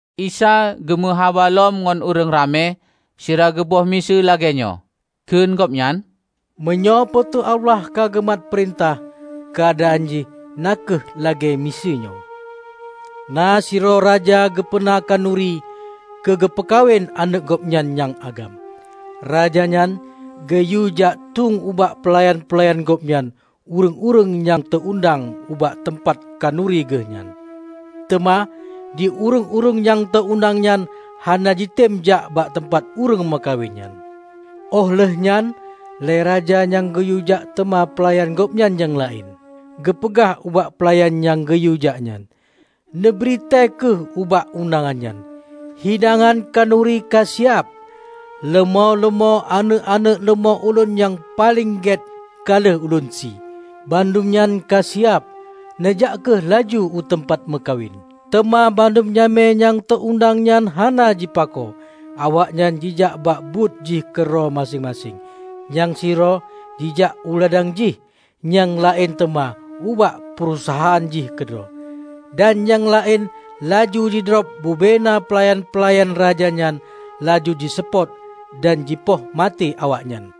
Isa geu meu haba lom ngon ureuëng ramé sira geuboh miseue lagée nyoe, kheun Gobnyan, "Meunyoe Po teu Allah ka geumat peurintah, keuadaan jih na kheueh lagée miseue nyoe: na sidroe raja geupeuna khanuri keu geupeukawen aneuëk gobnyan nyang agam. Raja nyan geuyue jak tueng ubak peulayan-peulayan gobnyan ureuëng-ureuëng nyang teu-undang ubak teumpat khanuri geuh nyan. Teuma di ureuëng-ureuëng nyang teu-undang nyan hana jitem jak bak teumpat ureuëng meukawen nyan. Óh lheueh nyan lé raja nyan geuyue jak teuma peulayan gobnyan nyang laén. Geupeugah ubak peulayan nyang geuyue jak nyan: 'Neubri tée kheueh ubak undangan nyan: Hidangan khanuri ka siab. Leumô-leumô aneuëk-aneuëk leumô ulôn nyang paleng gét ka lheueh ulôn sie. Bandum nyan ka siab. Neujak kheueh laju u teumpat meukawen!' Teuma bandum jamé nyang teu-undang nyan hana jipako. Awaknyan jijak bak buet jih keudroe maséng-maséng -- nyang sidroe jijak u ladang jih, nyang laén teuma ubak peurusahaan jih keudroe; dan nyang laén laju jidrob bubena peulayan-peulayan raja nyan, laju jiseupôt dan jipoh maté awaknyan.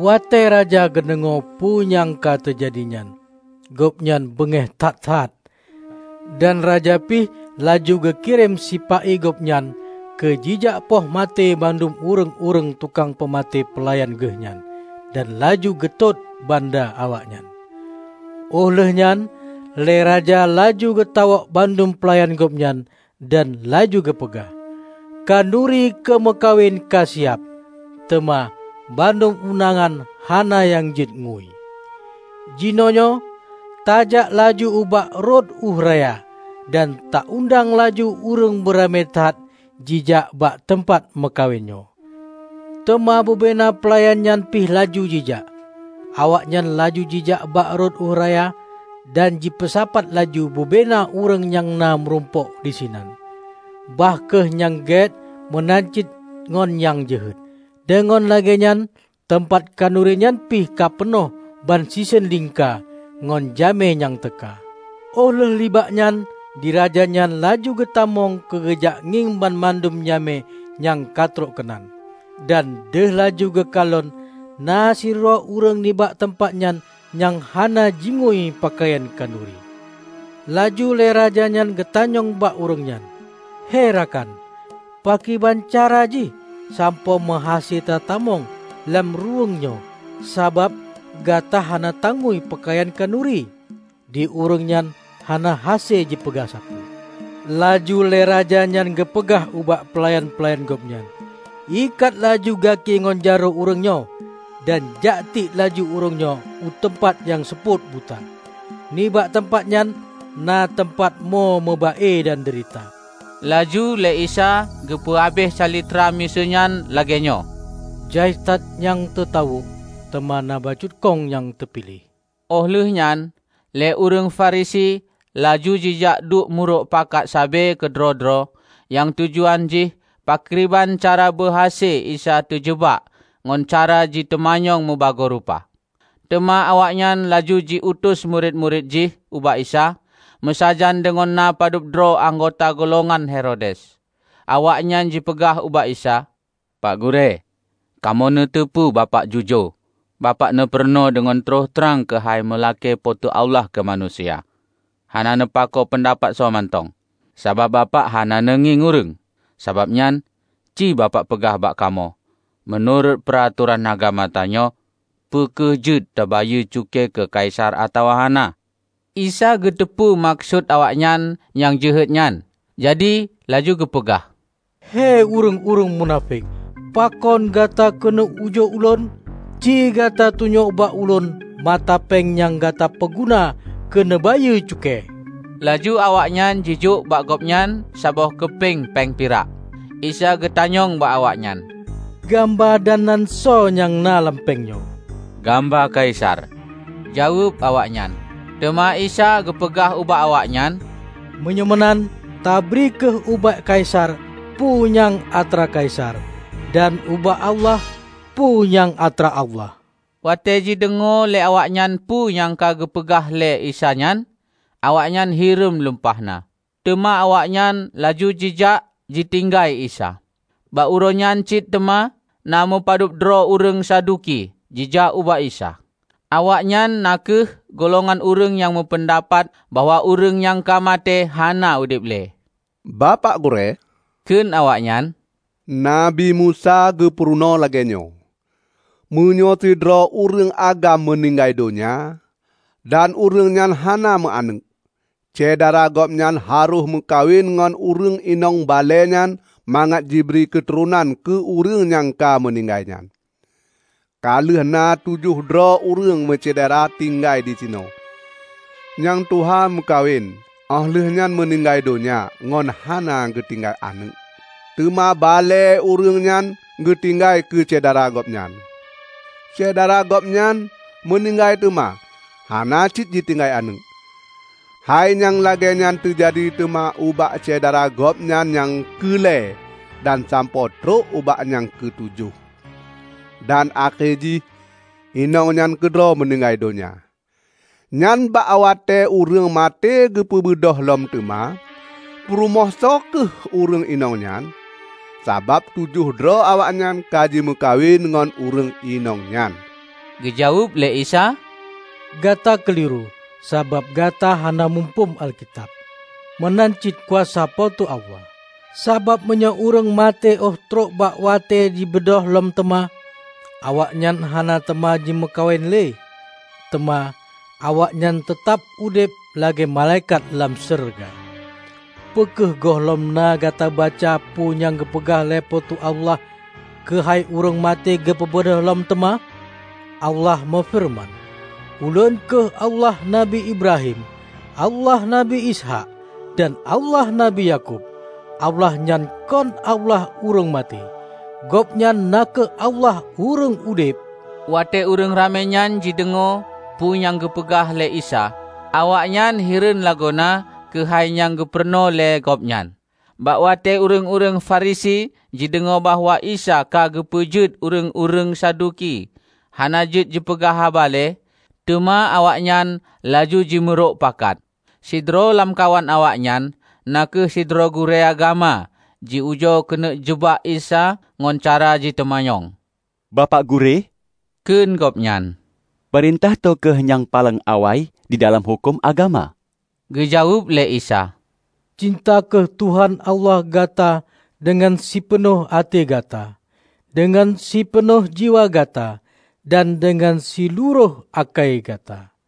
Watée raja geudeungoe peue nyang ka teujadi nyan, gobnyan beungéh that-that. Dan raja pih laju geukirém sipa-i gobnyan keu jijak poh maté bandum ureuëng-ureuëng tukang peumaté peulayan geuh nyan, dan laju geutot banda awaknyan. Óh lheueh nyan lé raja laju geutawök bandum peulayan gobnyan, dan laju geupeugah, 'Khanuri keu meukawen ka siab, teuma bandum undangan hana nyang jeuet ngui. Jinoenyoe tajak laju ubak rot ueh raya, dan taundang laju ureuëng beuramé that jijak bak teumpat meukawen nyoe.' Teuma bubena peulayan nyan pih laju jijak. Awaknyan laju jijak bak rot ueh raya dan jipeusapat laju bubena ureuëng nyang na meurumpok disinan, bah kheueh nyang gét meunan cit ngon nyang jeuhet. Deungon lagée nyan teumpat khanuri nyan pih ka peunoh ban siseun lingka ngon jamé nyang teuka. Óh lheueh nibak nyan di raja nyan laju geutamong keu geujak ngieng banmandum jamé nyang ka trok keunan. Dan deuh laju geukalon na sidroe ureuëng nibak teumpat nyan nyang hana jingui peukayan khanuri. Laju lé raja nyan geutanyong bak ureuëng nyan, 'He rakan, pakriban cara jih sampoe meuhase tatamong lam ruweueng nyoe sabab gata hana tangui peukayan khanuri?' Di ureuëng nyan hana hase jipeugah sapeue. Laju lé raja nyan geupeugah ubak peulayan-peulayan gobnyan, 'Ikat laju gaki ngon jaroe ureuëng nyoe, dan jak tiek laju ureuëng nyoe u teumpat nyang seupôt buta. Nibak teumpat nyan na teumpat mo meuba-e dan deurita.' " Laju lé Isa geupeu habéh calitra miseue nyan lagée nyoe, "Jai that nyang teutawök, teuma na bacut khong nyang teupiléh." Óh lheueh nyan lé ureuëng Farisi laju jijak duek meurok pakat sabe keudroe-droe nyang tujuan jih pakriban cara beuhase Isa teujeubak ngon cara jiteumanyong meubagoe rupa. Teuma awaknyan laju ji utus murit-murit jih ubak Isa meusajan deungon na padub droe anggota golongan Herodes. Awaknyan jipeugah ubak Isa, "Pak Gurée, kamoe meuteupeue Bapak jujoe. Bapak neupurunoe deungon troh trang keuhai meulakée Po teu Allah keu manusia, hana neupakoe peundapat soe mantong. Sabab Bapak hana neungieng ureuëng. Sabab nyan, ci Bapak peugah bak kamoe: Meunurot peuratoran agama tanyoe, peu kheueh jeuet teubayeue cukée keu kaisar atawa hana?" Isa geuteupeue meukeusut awaknyan nyang jeuhet nyan, jadi laju geupeugah, "He, ureuëng-ureuëng munafék! Pakon gata keuneuk ujoe Ulôn? Ci gata tunyok bak Ulôn mata péng nyang gata peuguna keu neubayeue cukée!" Laju awaknyan jijok bak Gobnyan saboh keupeng péng pirak. Isa geutanyong bak awaknyan, "Gamba dan nan soe nyang na lam péng nyoe?" "Gamba Kaisar," jaweueb awaknyan. Teuma Isa geupeugah ubak awaknyan, "Meunyoe meunan, tabri kheueh ubak Kaisar peue nyang atra Kaisar, dan ubak Allah peue nyang atra Allah." Watée jideungoe lé awaknyan peue nyang ka geupeugah lé Isa nyan, awaknyan hireuen lumpahna. Teuma awaknyan laju jijak jitinggai Isa. Bak uroe nyan cit teuma, na meupadub droe ureuëng Saduki jijak ubak Isa. Awaknyan na kheueh golongan ureuëng nyang meupeundapat bahwa ureuëng nyang ka maté hana udeb lé. "Bapak Gurée," kheun awaknyan, "Nabi Musa na geupurunoe lagée nyoe: Meunyoe sidroe ureuëng agam meuninggai donya, dan ureuëng nyan hana meu-aneuëk, syedara gobnyan harôh meukawen ngon ureuëng inong balée nyan mangat jibri keuturonan keu ureuëng nyang ka meuninggai nyan. Ka lheueh na tujoh droe ureuëng meusyedara tinggai di sinoe. Nyang tuha meukawen óh lheueh nyan meuninggai donya ngon hana geutinggai aneuëk. Teuma balée ureuëng nyan geutinggai keu syedara gobnyan. Syedara gobnyan nyan meuninggai teuma hana cit jitinggai aneuëk. Hai nyang lagée nyan teujadi teuma ubak syedara gobnyan nyang keu lhée dan sampoe trok bak nyang keu tujoh. Dan akhé jih inong nyan keudroe meuninggai donya. Nyan, bak watée ureuëng maté geupeubeudôh lom teuma, peurumoh soe kheueh ureuëng inong nyan? Sabab ban tujoh droe awaknyan ka jimeukawen ngon ureuëng inong nyan." Geujaweueb lé Isa, "Gata keuliru, sabab gata hana muphom Alkitab, meunan cit kuasa Po teu Allah. Sabab meunyoe ureuëng maté óh trok bak watée jibeudôh lom teuma, awaknyan hana teuma jimeukawen lé, teuma awaknyan teutab udeb lagée malaikat lam syeuruga. Peu kheueh gohlom na gata baca peue nyang geupeugah lé Po teu Allah keuhai ureuëng maté geupeubeudôh lom teuma? Allah meufeureuman, 'Ulôn kheueh Allah Nabi Ibrahim, Allah Nabi Ishaq dan Allah Nabi Yakub.' Allah nyan kon Allah ureuëng maté. Gobnyan na kheueh Allah ureuëng udeb!" Watée ureuëng ramé nyan jideungoe peue nyang geupeugah lé Isa, awaknyan hireuen lagoena keuhai nyang geupurunoe lé Gobnyan. Bak watée ureuëng-ureuëng Farisi jideungoe bahwa Isa ka geupeujeuet ureuëng-ureuëng Saduki hana jeuet jipeugah haba lé, teuma awaknyan laju jimeurok pakat. Sidroe lamkawan awaknyan, na kheueh sidroe gurée agama, ji-ujoe keuneuk jeubak Isa ngon cara jiteumanyong. "Bapak Gurée," kheun gobnyan, "peurintah toh kheueh nyang paleng awai didalam huköm agama?" Geujaweueb lé Isa, "Cinta kheueh Tuhan Allah gata deungon sipeunoh até gata, deungon sipeunoh jiwa gata, dan deungon silurôh ákai gata.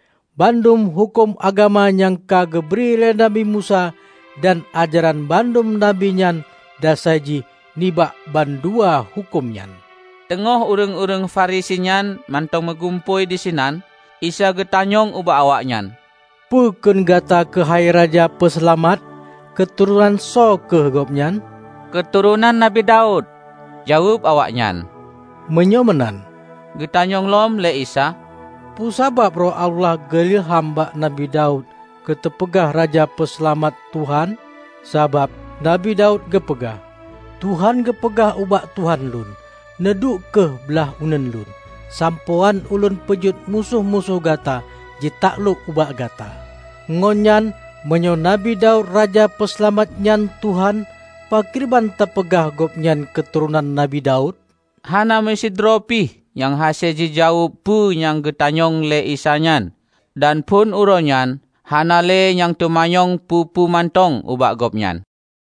Bandum huköm agama nyang ka geubri lé Nabi Musa dan ajaran bandum nabi nyan dasai jih nibak bandua huköm nyan." Teungoh ureuëng-ureuëng Farisi nyan mantong meugumpôi disinan, Isa geutanyong ubak awaknyan, "Peue kheun gata keuhai Raja Peuseulamat? Keuturonan soe kheueh gobnyan?" "Keuturonan Nabi Daud," jaweueb awaknyan. "Meunyoe meunan," geutanyong lom lé Isa, "peue sabab Roh Allah geu ilham bak Nabi Daud keu teupeugah Raja Peuseulamat 'Tuhan'? Sabab Nabi Daud geupeugah. 'Tuhan geupeugah ubak Tuhan lôn: neuduek kheueh blaih uneuen Lôn, sampoe án Ulôn peujeuet musoh-musoh Gata jitaklok ubak Gata.' Ngon nyan meunyoe Nabi Daud Raja Peuseulamat nyan 'Tuhan', pakriban tapeugah Gobnyan keuturonan Nabi Daud?" Hana meusidroe pih nyang hase jijaweueb peue nyang geutanyong lé Isa nyan. Dan phon uroe nyan, hana lé nyang teumanyong peue-peue mantong ubak Gobnyan.